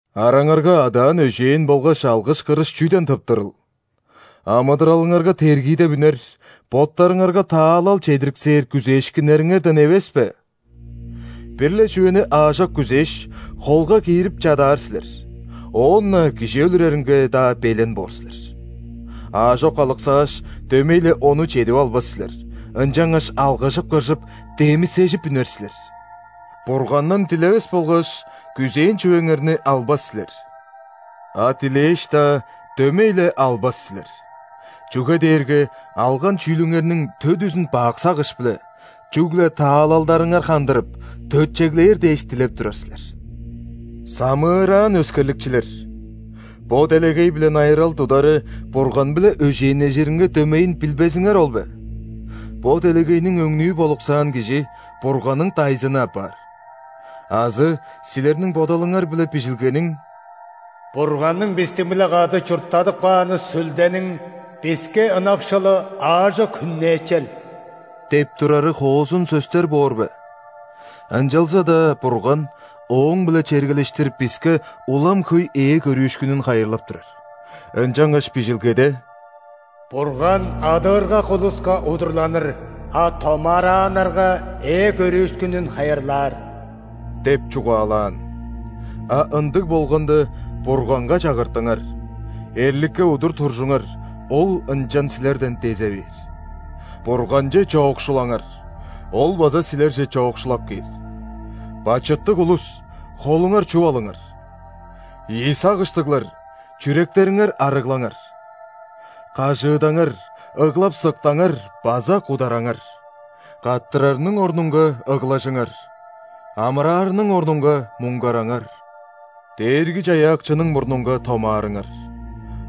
Араңарга адаан-өжээн болгаш алгыш-кырыш чүден тыптырыл? Амыдыралыңарга тергиидеп үнер, боттарыңарга таалал чедириксээр күзээшкиннериңерден эвес бе? Бир-ле чүвени аажок күзээш, холга киирип чадаар силер, оон-на кижи өлүреринге-даа белен боор силер. Аажок алыксааш, дөмей-ле ону чедип албас силер, ынчангаш алгыжып-кыржып, демисежип үнер силер. Бургандан дилевес болгаш, күзээн чүвеңерни албас силер. А дилээш-даа, дөмей-ле албас силер. Чүге дээрге алган чүүлүңерниң төдүзүн бак сагыш-биле – чүгле таалалдарыңар хандырып, төтчеглээр дээш дилеп турар силер. Самыыраан өскерликчилер! Бо делегей-биле найырал тудары Бурган-биле өжээннежиринге дөмейин билбезиңер ол бе? Бо делегейниң өңнүү болуксаан кижи Бурганның дайзыны апаар. Азы силерниң бодалыңар-биле Бижилгениң: «Бурганның бистиң-биле кады чурттадып кааны Сүлдениң биске ынакшылы аажок хүннээчел» – деп турары хоозун сөстер боор бе? Ынчалза-даа Бурган ооң-биле чергелештир биске улам хөй ээ көрүүшкүнүн хайырлап турар. Ынчангаш Бижилгеде:«Бурган адыыргак улуска удурланыр,а томаарааннарга ээ көрүүшкүнүн хайырлаар» деп чугаалаан. А ындыг болганда, Бурганга чагыртыңар, эрликке удур туржуңар, ол ынчан силерден дезе бээр. Бурганче чоокшулаңар, Ол база силерже чоокшулап кээр. Бачыттыг улус, холуңар чуп алыңар. Ийи сагыштыглар, чүректериңер арыглаңар. Кажыыдаңар, ыглап-сыктаңар база кудараңар. Каттырарының орнунга, ыглажыңар, амыраарының орнунга, муңгараңар. Дээрги-Чаяакчының мурнунга томаарыңар,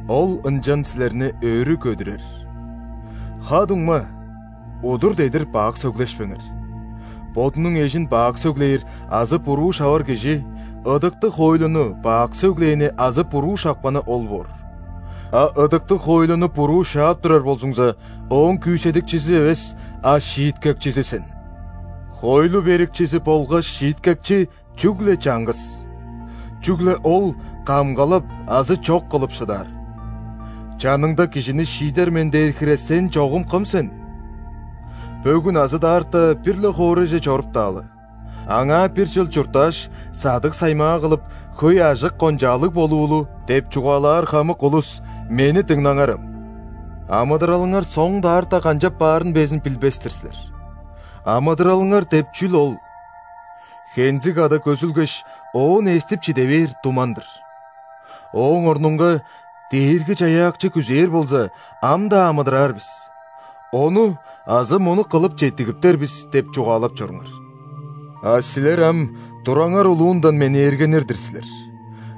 Ол ынчан силерни өрү көдүрер. Ха-дуңма, удур-дедир бак сөглешпеңер. Бодунуң эжин бак сөглээр азы буруу шавар кижи ыдыктыг хоойлуну бак сөглээни азы буруу шапканы ол боор. А ыдыктыг хоойлуну буруу шаап турар болзуңза, ооң күүседикчизи эвес, а шииткекчизи сен. Хоойлу Берикчизи болгаш Шииткекчи – чүгле чаңгыс, чүгле Ол камгалап азы чок кылып шыдаар. Чаныңда кижини шиидер мен дээр хире сен чогум кым сен? «Бөгүн азы даарта бир-ле хоорайже чоруптаалы. Аңаа бир чыл чурттааш, садыг-саймаа кылып, хөй ажык-кончаалыг болуулу» – деп чугаалаар хамык улус, мени дыңнаңарам. Амыдыралыңар соң-даарта канчап баарын безин билбес-тир силер. Амыдыралыңар деп чүл ол? Хензиг када көзүлгеш, оон эстип чиде бээр туман-дыр. Ооң орнунга: «Дээрги-Чаяакчы күзээр болза, ам-даа амыдыраар бис, ону азы мону кылып четтигиптер бис» – деп чугаалап чоруңар. А силер ам тураңар улуундан менээргенир-дир силер: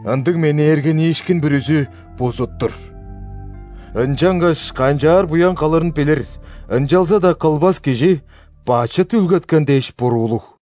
ындыг менээргениишкин бүрүзү – бузут-тур! Ынчангаш канчаар буян кылырын билир, ынчалза-даа кылбас кижи – бачыт үүлгеткен дээш буруулуг!